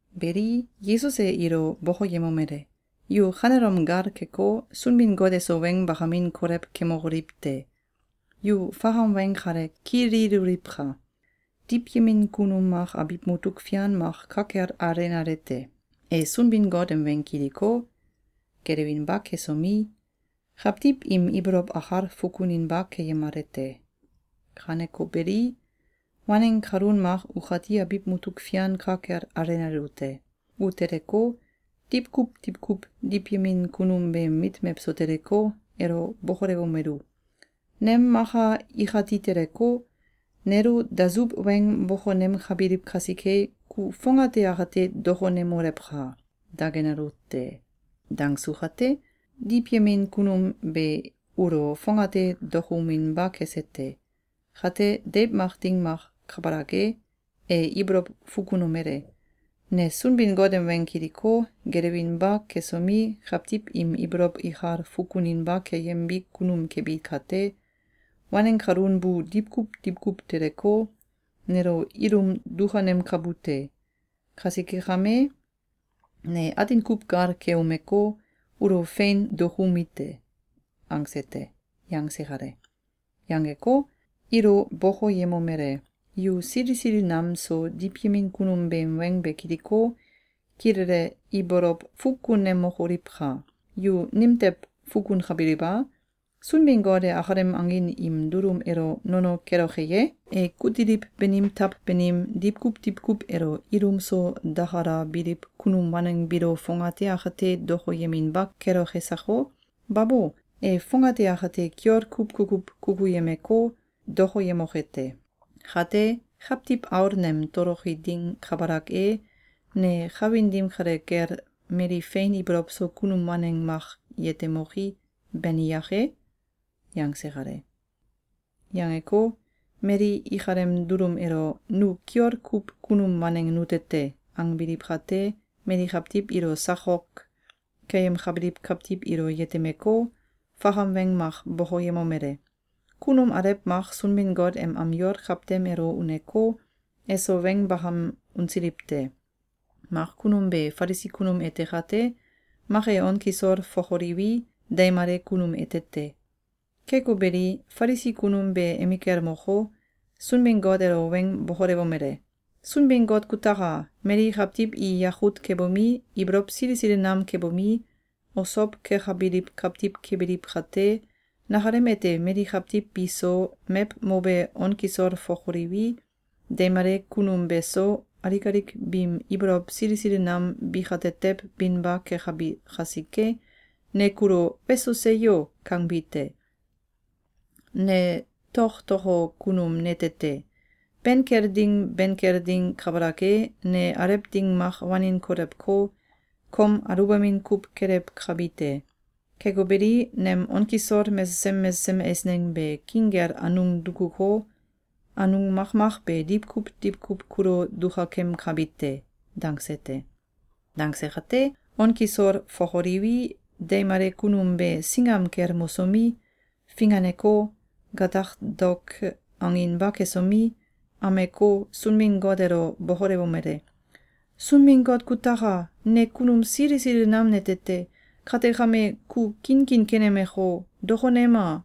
Beli, Yesus e ilo bokoyemomele: “Yu kanelom gal keko, Sunbin-Got eso weng bakamin kolew kemokoliw te! Yu fakam weng kale kililoliwka! Diwyemin kunum mak abiw mutuk fian mak ka kel alenale te. E Sunbin-Got em weng kiliko, gelewinba kesomi, kawtiw im ibolow akal fukuninba keyemale te. Kaneko beli, waneng kalun mak ukati abiw mutuk fian ka kel alenalu te. U teleko, diwkuw diwkuw diwyemin kunum beem mit mewso teleko, elo bokolewomelu: ‘Nem maka ikati teleko, nelo dasuw weng bokonemkabiliw kasike, ku fongate akate dokonemolewka!’, dangenalu te. Dangsu kate, diwyemin kunum be ulo fongate dokouminba kese te. Kate, deiw mak ding mak kabalak e, e ibolow fukunomele: ‘Ne Sunbin-Got em weng kiliko, gelewinba kesomi, kawtiw im ibolow ikal fukuninba keyembi kunum kebi kate, waneng kalun bu diwkuw diwkuw teleko, nelo ilum dukanemkabu te. Kasike kame, ne atin kuw gal keumeko, ulo fein dokoumi te!’, angse te.”, yangse kale. Yangeko, ilo bokoyemomele: “Yu sili sili nam so diwyemin kunum beem weng be kiliko, kilele ibolow fukunemokoliwka! Yu nimtew fukunkabiliw a? Sunbin-Got e akalem angin im dulum elo nono keloke ye? E kutiliw banim taw banim, diwkuw diwkuw elo ilum so dakalabiliw kunum waneng biilo fongate akate dokoyeminba keloke sako? Babo! E fongate akate kiol kuw kukuw kukuyemeko, dokoyemoke te! Kate, Kawtiw Aul nem toloki ding kabalak e, ne kawin dim kale kel mali fein ibolow so kunum waneng mak yetemoki, bani yake?”, yangse kale. Yangeko, mali ikalem dulum elo “Nu kiol kuw kunum waneng nute te!”, angbiliw kate, mali kawtiw ilo sakok keyemkabiliw kawtiw ilo yetemeko, fakam weng mak bokoyemomele: “Kunum alew mak Sunbin-Got em am yol kawtem elo uneko, eso weng bakam unsiliw te. Mak kunum be Falisi kunum ete kate, mak e on kisol fokoliwi, deimale kunum ete te. Keko beli, Falisi kunum be emikel moko, Sunbin-Got elo weng bokolewomele: ‘Sunbin-Got kutaka! Mali kawtiw i yakut kebomi, ibolow sili sili nam kebomi, osow kekabiliw kawtiw kebiliw kate, nakalem ete mali kawtiw bi so, mew mobe on kisol fokoliwi, deimale kunum beso, alik alik biim ibolow sili sili nam bikatetew binba kekabi kasike, ne kulo ‘Weso seyo!’, kangbi te. Ne toktoko kunum nete te! Ben kel ding ben kel ding kabalak e, ne alew ding mak wanin kolewko, kom aluwbamin kuw kelewkabi te. Keko beli, nem on kisol mesesem mesesem eisneng be king kel anung dukuko, anung makmak be diwkuw diwkuw kulo dukakemkabi te.’, dangse te. Dangse kate, on kisol fokoliwi, deimale kunum be singam kel mosomi, finganeko, gatak daok anginba kesomi, ameko, Sunbin-Got elo bokolewomele: ‘Sunbin-Got kutaka! Ne kunum sili sili nam nete te. Kate kame, ku kinkin kenemeko, dokonema!’,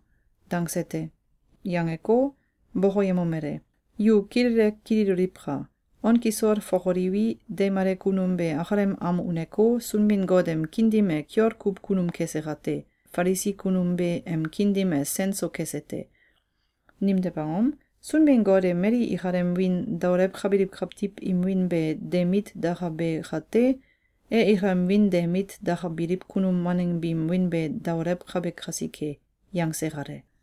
dangse te.”, yangeko, bokoyemomele: “Yu kilele kililoliwka! On kisol fokoliwi, deimale kunum be akalem am uneko, Sunbin-Got em kiin dim e kiol kuw kunum kese kate, Falisi kunum be em kiin dim e sen so kese te. Nimtew angom? Sunbin-Got e mali ikalem wiin daolewkabiliw kawtiw im wiin be de mit dakabe kate, e ikalem wiin de mit dakabiliw kunum waneng biim wiin be daolewkabe kasike.”, yangse kale.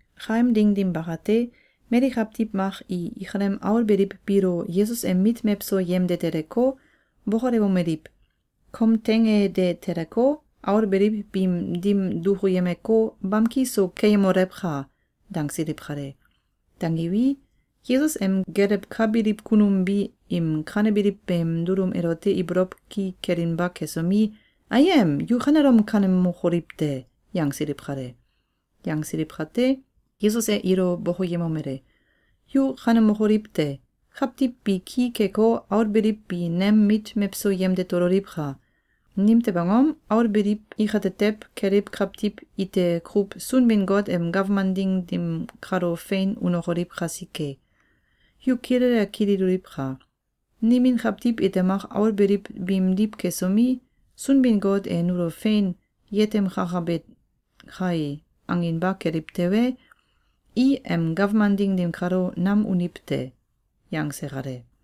Kaem ding dim bakate, mali kawtiw mak i ikalem aul beliw biilo Yesus em mit mewso yemde teleko, bokolewomeliw: “Kom teing e de teleko, aul beliw biim dim dukuyemeko, bamki so keyemolewka!” dangsiliw kale. Dangiwi, Yesus em gelewkabiliw kunum bi im kanebiliw beem dulum elote ibolow ki kelinba kesomi, ‘Ayem! Yu kanelom kanemokoliw te!’, yangsiliw kale. Yangsiliw kate, Yesus e ilo bokoyemomele: “Yu kanemokoliw te! Kawtiw bi ki keko, aul beliw bi nem mit mewso yemde tololiwka! Nimtew angom? Aul beliw ikatetew keliw kawtiw ite kuw Sunbin-Got em gawman ding dim kalo fein unokoliw kasike. Yu kilele kililoliwka! Nimin kawtiw ite mak aul beliw biimdiw kesomi, ‘Sunbin-Got e nulo fein yetemkakabe kae!’, anginba keliw tewe, i em gawman ding dim kalo nam uniw te.”, yangse kale.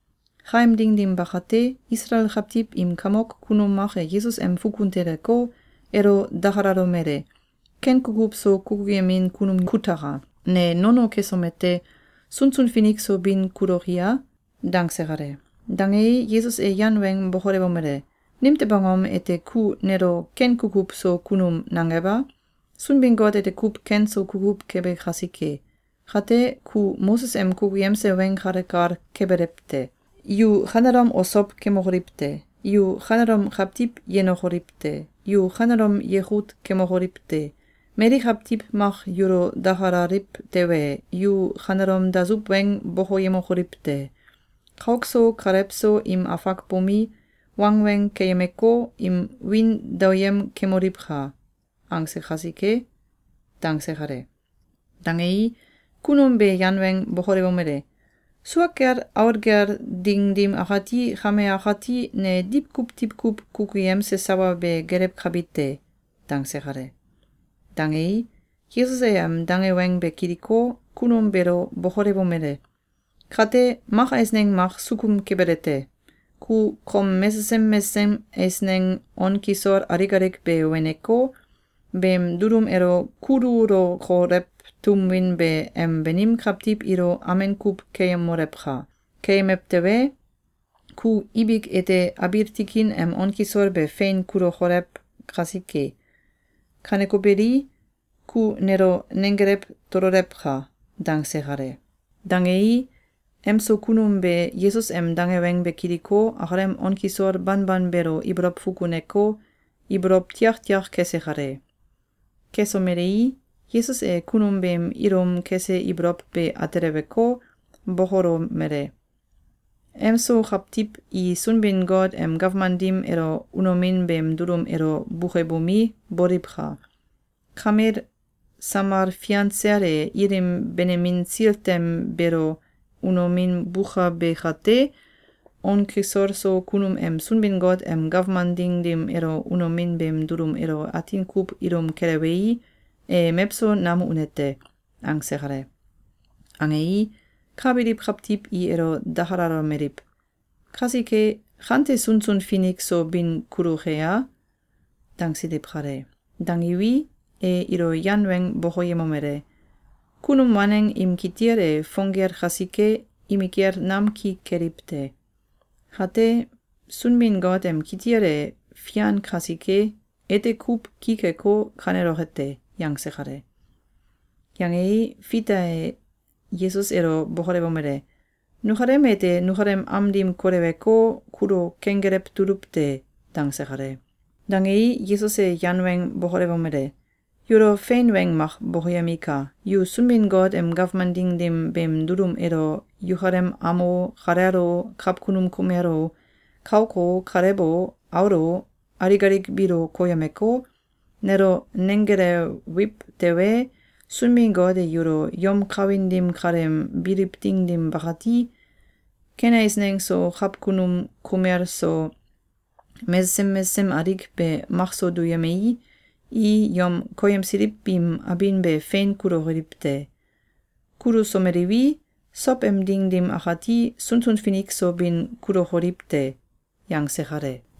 Kaem ding dim bakate, Isalael kawtiw im kamok kunum mak e Yesus em fukun teleko, elo dakalalomele: “Ken kukuw so kukuyemin kunum kutaka! Ne nono kesomete, sunsun finik so bin kuloki a?”, dangse kale. Dangei, Yesus e yan weng bokolewomele: “Nimtew angom ete ku nelo ‘ken kukuw so kunum’ nangew a? Sunbin-Got ete kuw ken so kukuw kebe kasike! Kate, ku Moses em kukuyemse weng kale kal kebelewte: ‘Yu kanelom osow kemokoliw te! Yu kanelom kawtiw yenokoliw te! Yu kanelom yekut kemokoliw te! Mali kawtiw mak yulo dakalaliw tewe, yu kanelom dasuw weng bokoyemokoliw te! Kauk so kalew so im afak bomi, wangweng keyemeko, im wiin daoyem kemoliwka!’, angse kasike.”, dangse kale. Dangei, kunum be yan weng bokolewomele: “Sua kel aul gel ding dim akati, kame akati, ne diwkuw diwkuw kukuyemse sawa be gelewkabi te.”, dangse kale. Dangei, Yesus e em dange weng be kiliko, kunum beelo bokolewomele: “Kate, mak eisneng mak sukum kebelete: Ku kom mesesem mesesem eisneng on kisol alik alik be weneko, beem dulum elo kululokolew tum win be em banim kawtiw ilo amen kuw keyemolewka! Keyemew tewe, ku ibik ete abiil tikin em on kisol be fein kulokolew kasike. Kaneko beli, ku nelo nenggelew tololewka!”, dangse kale. Dangei, em so kunum be Yesus em dange weng be kiliko, akalem on kisol banban beelo ibolow fukuneko, ibolow tiaktiak kese kale. Kesomelei, Yesus e kunum beem ilum kese ibolow be ateleweko, bokolomele: “Em so kawtiw i Sunbin-Got em gawman dim elo unomin beem dulum elo bukebomi, boliwka! Kamel samal fian sel e ilim benemin sil tem beelo unomin bukabe kate, on kisol so kunum em Sunbin-Got em gawman ding dim elo unomin beem dulum elo atin kuw ilum kelewei, e mewso nam une te.”, angse kale. Angei, ka biliw kawtiw i elo dakalalomeliw: “Kasike, kante sunsun finik so bin kuluke a?”, dangsiliw kale. Dangiwi, e ilo yan weng bokoyemomele: “Kunum waneng im kitil e fong gel kasike, imikel nam ki keliw te. Kate, Sunbin-Got em kitil e fian kasike, ete kuw ki keko, kaneloke te.”, yangse kale. Yangei, Fita e Yesus elo bokolewomele: “Nukalem ete nukalem am dim koleweko, kulo kenggelew tuluw te.”, dangse kale. Dangei, Yesus e yan weng bokolewomele: “Yulo fein weng mak bokoyemika! Yu Sunbin-Got em gawman ding dim beem dulum elo yukalem am o, kalel o, kawkunum kumel o, kauk o, kalew o, aul o, alik alik biilo koyemeko, nelo nenggelewiw tewe, Sunbin-Got e yulo yom kawin dim kaleem biliw ding dim bakati, ken eisneng so, kawkunum kumel so, mesesem mesesem alik be makso duyemei, i yom koyemsiliw biim abin be fein kulukoliw te. Kulusomeliwi, sow em ding dim akati, sunsun finik so bin kulokoliw te.”, yangse kale.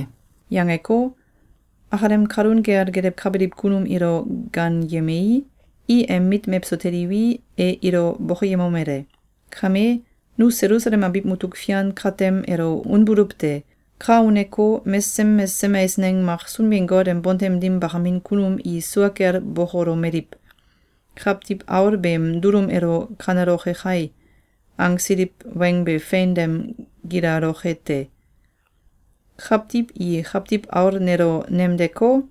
Yangeko, akalem kalun kel gelewkabiliw kunum ilo gaanyemei, i em mit mewso teliwi, e ilo bokoyemomele: “Kame, nu Selusalem abiw mutuk fian katem elo unbuluw te. Ka uneko, mesesem mesesem eisneng mak Sunbin-Got em bontem dim bakamin kunum i sua kel bokolomeliw: ‘Kawtiw Aul beem dulum elo kaneloke kai!’, angsiliw weng be fein dem gilaloke te. kawtiw i Kawtiw Aul nelo nemdeko,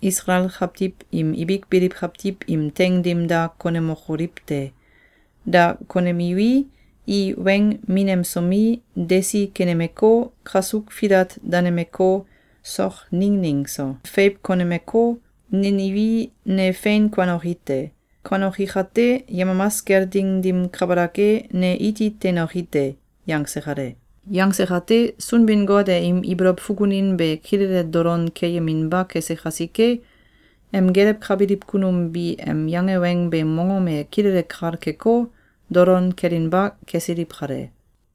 Isalael kawtiw im ibik biliw kawtiw im teing dim da konemokoliw te. Da konemiwi, i weng minemsomi, desi kenemeko, kasuk filat danemeko, sok nining so feiw konemeko, neniwi, ne fein kuanoki te. Kuanoki kate, yemamas kel ding dim kabalak e, ne iti teinoki te.”, yangse kale. Yangse kate, Sunbin-Got e im ibolow fukunin be kilele dolon keyeminba kese kasike, em gelewkabiliw kunum bi em yange weng beem mongom e kilele kal keko, dolon kelinba kesiliw kale.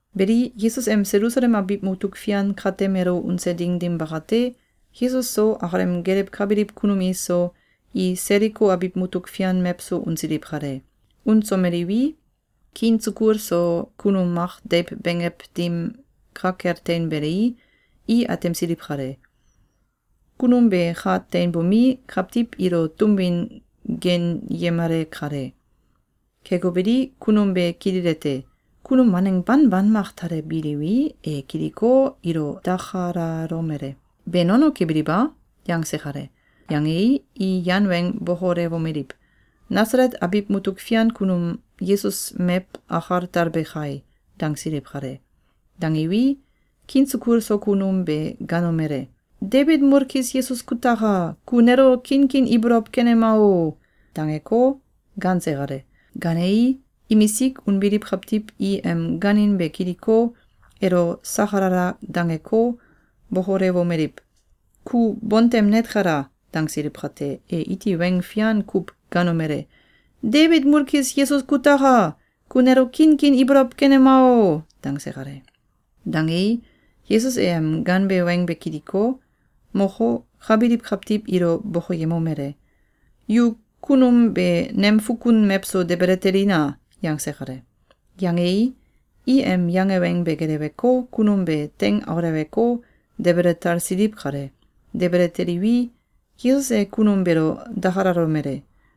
Beli, Yesus em Selusalem abiw mutuk fian katem elo unse ding dim bakate, Yesus so, akalem gelewkabiliw kunum iso, i Seliko abiw mutuk fian mewso unsiliw kale. Unsomeliwi, kiin sukul so kunum mak deiw benggew dim ka kel teinbelei, i atemsiliw kale. Kunum be ka teinbomi, kawtiw ilo tum win geenyemale kale. Keko beli, kunum be kililete: Kunum waneng banban mak talebiliwi, e kiliko, ilo dakalalomele: “Be nono kebiliw a?”, yangse kale. Yangei, i yan weng bokolewomeliw: “Nasalet abiw mutuk fian kunum Yesus mew akal talbe kai!”, dangsiliw kale. Dangiwi, kiin sukul so kunum be gaanomele: “Debit mulkis Yesus kutaka! Ku nelo kinkin ibolow kenema o!”, dangeko, gaanse kale. Gaanei, imisik unbiliw kawtiw i em gaanin be kiliko, elo sakalala dangeko, bokolewomeliw: “Ku bontem net kela!”, dangsiliw kate, e iti weng fian kuw gaanomele: “Debit mulkis Yesus kutaka! Ku nelo kinkin ibolow kenema o!”, dangse kale. Dangei, Yesus e em gaanbe weng be kiliko, moko, ka biliw kawtiw ilo bokoyemomele: “Yu kunum be nem fukun mewso debele telina!”, yangse kale. Yangei, i em yange weng be geleweko, kunum be teing auleweko, debele talsiliw kale. Debele teliwi, Yesus e kunum beelo dakalalomele: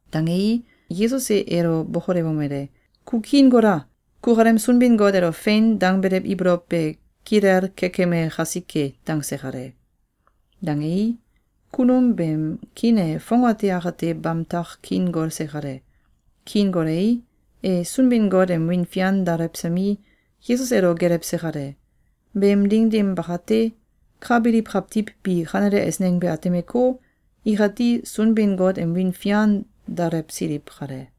Dangei, Yesus e elo bokolewomele: “Ku kiin gola! Kukalem Sunbin-Got elo ‘Fein!’, dangbelew ibolow be kilel kekeme kasike.”, dangse kale. Dangei, kunum beem kiin e fongate akate bamtak kiin golse kale. Kiin golei, e Sunbin-Got em wiin fian daolewsomi, Yesus elo gelewse kale. Beem ding dim bakate, ka biliw kawtiw bi kanele eisneng be atemeko, ikati Sunbin-Got em wiin fian daolewsiliw kale.